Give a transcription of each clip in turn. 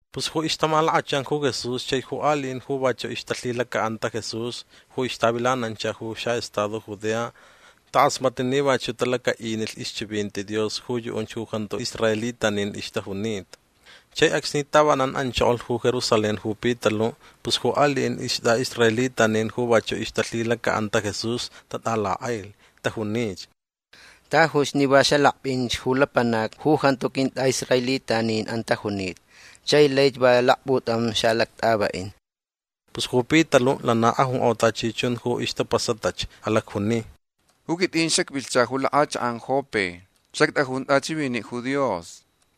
Pus ju ixtamalakachan ju Jesús chai ju aliʼin ju vachuʼ ixtalhilacaʼanta Jesús ju ixtavilanancha ju xaʼestado Judea takʼasmatlh ni vachuʼ talacaʼinilh ixchivinti Dios ju yuʼunch ju jantu israelitanin ixtajunita. Chai acsni tavanan anchokolh ju Jerusalén ju Pitaluʼ pus ju aliʼin istʼaʼisraelitanin ju vachuʼ ixtalhilacaʼanta Jesús tatʼalakʼailh. Tajunich: ―Tajuch ni va xalakpʼinch ju lapanacni ju jantu quintʼaʼisraelitaninʼan tajunita chai laich va lakputam xaʼalactʼavaʼin. Pus ju Pitaluʼ lana ajunkʼo tachi chun ju ixtapasatach. Alacjuni: ―Ju quitʼin xacvilhcha ju lakʼachakʼan Jope. Xactʼajun tʼachiviniʼ ju Dios.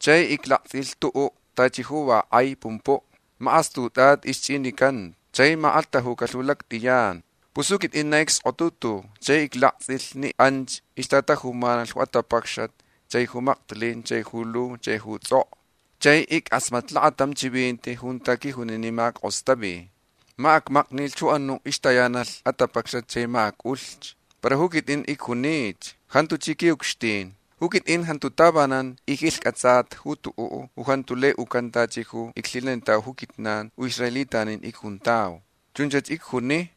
Chai iclaktsʼilh tuʼuʼ tachi ju va kʼai pumpuʼ. Makʼastutʼatʼi ixchʼinicanta. Chai makʼalhtajucalh ju lactʼiyan. Pus ju quitʼin na icskotutulh chai iclaktsʼilh ni anch ixtatajumanalh ju atapacxat chai ju maktilin chai ju lu chai ju tsʼokʼo. Chai ickʼasmatlh lakatam chivinti junta quijuni ni ma ackʼostavi. Ma acʼamaknilh ju anuʼ ixtayanalh atapacxat chai ma acʼulh. Para ju quitʼin icjunich: “Jantuch ji quiʼucxtin. Ju quitʼin jantu tavanan icquilhcʼatsata ju tuʼuʼ ju jantu lai ucan tachi ju iclhilanitauch ju quijnan ju israelitanin icjuntau”. Chunch icjuni.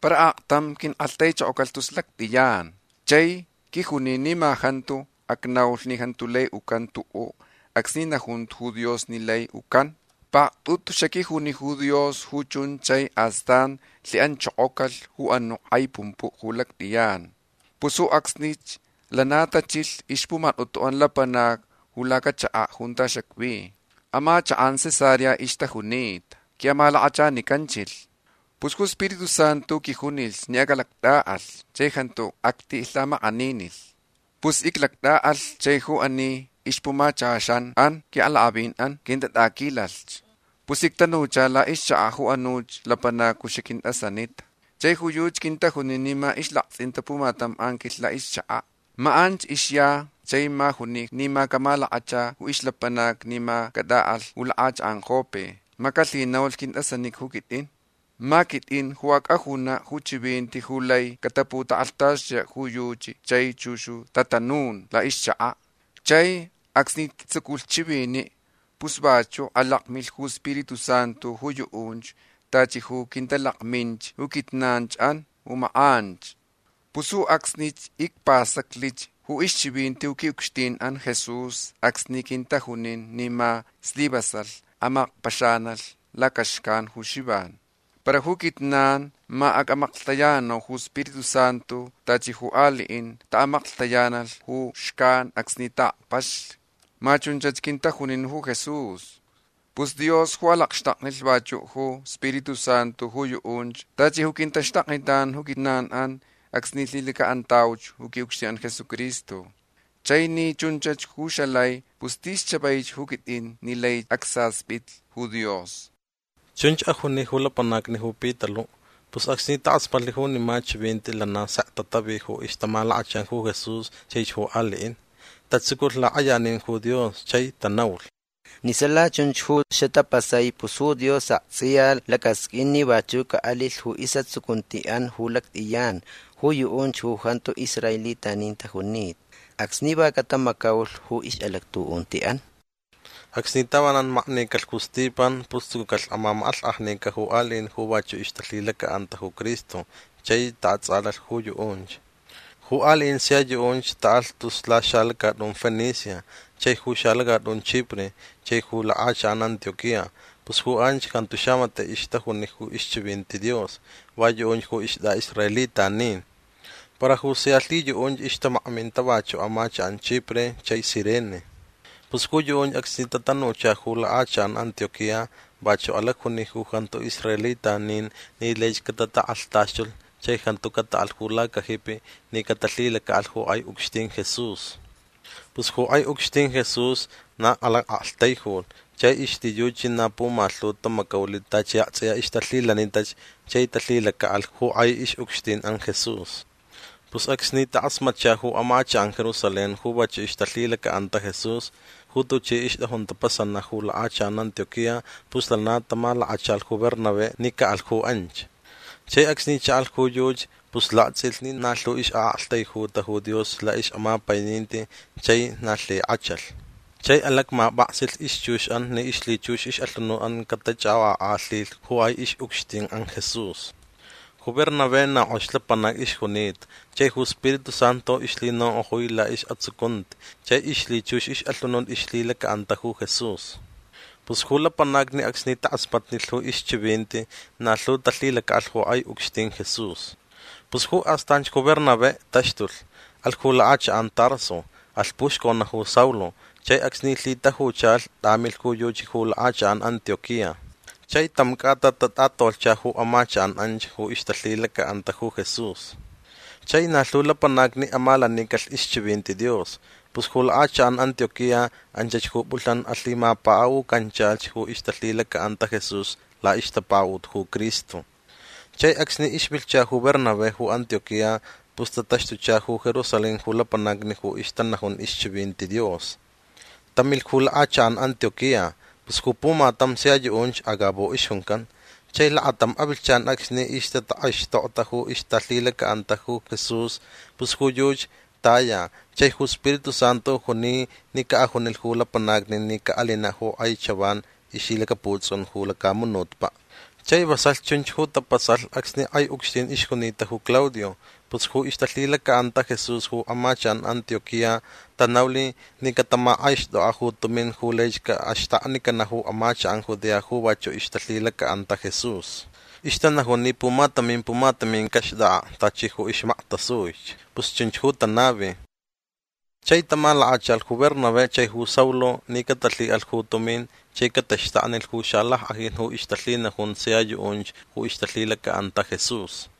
Para aktam quinkʼalhtaichokocalh tus lactʼiyan. Chai quijuni ni ma jantu acnaulh ni jantu lai ucan tuʼu acsni najuntach ju Dios ni lai ucan. Paktʼutuch xaquijuni ju Dios ju chunch chai astan lhiʼanchokocalh ju anuʼ kʼai pumpuʼ ju lactʼiyan. Pus ju acsnich lana tachilh ixpumatʼutuʼan lapanacni ju lacachakaʼ junta xacvi. Amachakʼan Cesarea ixtajunita. Quiʼamalakachanicanchilh. Pus ju Spiritu Santu quijunilh ni acʼalactʼaʼalh chai jantu actilhamakʼaninilh. Pus icʼalactʼaʼalh chai ju ani ixpumachaxanʼan quiʼalakʼavinʼan quintatʼaquilalh. Pus ictanuchauch laʼixchakaʼ ju anuch lapanac ju xaquintʼasanita. Chai ju yuchi quintajunin ni ma ixlaktsʼinta pumatam anquilh laʼixchakaʼ. Ma anch ixya chai ma juni ni ma camalakachalh ju ixlapanacni ni ma cataʼalh ju lakʼachakʼan Jope. Ma calhinaulh quintʼasanica ju quitʼin. Ma quitʼin ju acʼajunach ju chivinti ju lai cataputakʼalhtaxtuyaʼ ju yuchi chai chux ju tatanun laʼixchakaʼ. Chai acsni ictsuculh chiviniʼ pus vachuʼ alakmilh ju Spiritu Santu ju yuʼunch tachi ju quintalakminch ju quijnanchʼan ju makʼanch. Pus ju acsnich icpastaclich ju ixchivinti ju quiʼucxtinʼan Jesús acsni quintajunin ni ma slivasalh amakpaxanalh lacaxcan ju Xivan. Para ju quijnan ma acʼamaklhtayananau ju Spiritu Santu tachi ju aliʼin taʼamaklhtayanalh ju xcan acsni taʼakpaxlh. Ma chunch quintajunin ju Jesús. Pus Dios ju alacxtaknilh vachuʼ ju Spiritu Santu ju yuʼunch tachi ju quintaxtaknitan ju quijnanʼan acsni lhilacaʼantauch ju quiʼucxtinʼan Jesucristo. Chai ni chunch ju xalai pus tis chavaich ju quitʼin ni lai acsaspitlh ju Dios. ―Chunch ajuni ju lapanacni ju Pitaluʼ. Pus acsni takʼasmatlh junima chivinti lana sek tatavi ju ixtamalakachan ju Jesús chaich ju aliʼin. Tatsuculh lakʼayanin ju Dios. Chai tanaulh: ―Ni sala chunch ju xatapasai pus ju Dios aktsʼiya lacasqʼuin ni vachuʼ caʼalilh ju isʼatsucuntiʼan ju lactʼiyan ju yuʼunch ju jantu israelitanin tajunita acsni va catamacaulh ju ixʼalactuʼuntiʼan. Acsni tavanan maknicalh ju Stipan pus tsucucalh mamakʼalhkʼajninin ju aliʼin ju vachuʼ ixtalhilacaʼanta ju Cristo chai taʼatsʼalalh ju yuʼunch. Ju aliʼin sia yuʼunch taʼalh tus laxalacatʼun Fenicia chai ju xalacatʼun Chipre chai ju lakʼachakʼan Antioquía. Pus ju anch jantu xamatiʼ ixtajuni ju ixchivinti Dios. Va yuʼunch ju istʼaʼisraelitanin. Para ju sia lhiyuʼunch ixtamakminta vachuʼ amachakʼan Chipre chai Cirene. Pus ju yuʼunch acsni tatanucha ju lakʼachakʼan Antioquía vachuʼ alacjuni ju jantu israelitanin ni laich catatakʼalhtaxtulh chai jantu cataʼalh ju lacajipi ni catalhilacaʼalh ju kʼai ucxtin Jesús. Pus ju kʼai ucxtin Jesús na alacʼaktaijulh chai ixlhiyuchi na pumalhu tamacaulh tachi aktsʼiya ixtalhilanitach chai talhilacaʼalh ju kʼai ixʼucxtinʼan Jesús. Pus acsni takʼasmatcha ju amachakʼan Jerusalén ju vachuʼ ixtalhilacaʼanta Jesús ju tuchi ixtʼajun tapasanaʼ ju lakʼachakʼan Antioquía pus lana tamalakachalh ju Bernabé ni caʼalh ju anch. Chai acsni chaʼalh ju yuchi pus laktsʼilh ni na lhu ixʼaʼaktaijuta ju Dios laʼixʼamapaininti chai na lhikʼachalh. Chai alakmapʼaksilh ixchuxʼan ni ixlhichux ixʼalhunutʼan catachʼakʼokʼakʼalhilh ju kʼai ixʼucxtinʼan Jesús. Ju Bernabé na kʼox lapanac ixjunita chai ju Spiritu Santu ixlhinonkʼojui laʼisʼatsucunti chai ixlhichux ixʼalhunut ixlhilacaʼanta ju Jesús. Pus ju lapanacni acsni takʼasmatnilh ju ixchivinti na lhu talhilacaʼalh ju kʼai ucxtin Jesús. Pus ju astanch ju Bernabé taxtulh. Alhch ju lakʼachakʼan Tarso. Alh puxconaʼ ju Saulo. Chai acsni lhitajucha tʼamilh ju yuchi ju lakʼachakʼan Antioquía. Chai tam cʼata tatʼatolhcha ju amachakʼan anch ju ixtalhilacaʼanta ju Jesús. Chai na lhu lapanacni amalanicalh ixchivinti Dios. Pus ju lakʼachakʼan Antioquía anchach ju pʼulhnan alhimapakaʼucanchalhch ju ixtalhilacaʼanta Jesús laʼixtapakaʼut ju Cristo. Chai acsni ixvilhcha ju Bernabé ju Antioquía pus tataxtucha ju Jerusalén ju lapanacni ju ixtanajun ixchivinti Dios. Tamilh ju lakʼachakʼan Antioquía. Pus ju pumatam sia yuʼunch Agabo ixjuncan. Chai lakatam avilhchan acsni ixtatakʼaixtokta ju ixtalhilacaʼanta Jesús pus ju yuchi taya chai ju Spiritu Santu juni ni caʼajunilh ju lapanacni ni caʼalinaʼ ju kʼai chavan ixlhilacaputsʼun ju lacamunutpaʼ. Chai vasalh chunch ju tapasalh acsni kʼai ucxtin ixjunita ju Claudio. Pus ju ixtalhilacaʼanta Jesús ju amachakʼan Antioquía tanaulh ni catamakʼaixtʼokʼaʼ ju tumin ju laich caʼaxtaknicanaʼ ju amachakʼan Judea ju vachuʼ ixtalhilacaʼanta Jesús. Ixtanajun ni pumatamin pumatamin caxtʼakʼaʼ tachi ju ixmaktasuich. Pus chunch ju tanavi. Chai tamalakachalh ju Bernabé chai ju Saulo ni catalhiʼalh ju tumin chai cataxtaknilh ju xalackʼajin ju ixtalhinajun sia yuʼunch ju ixtalhilacaʼanta Jesús.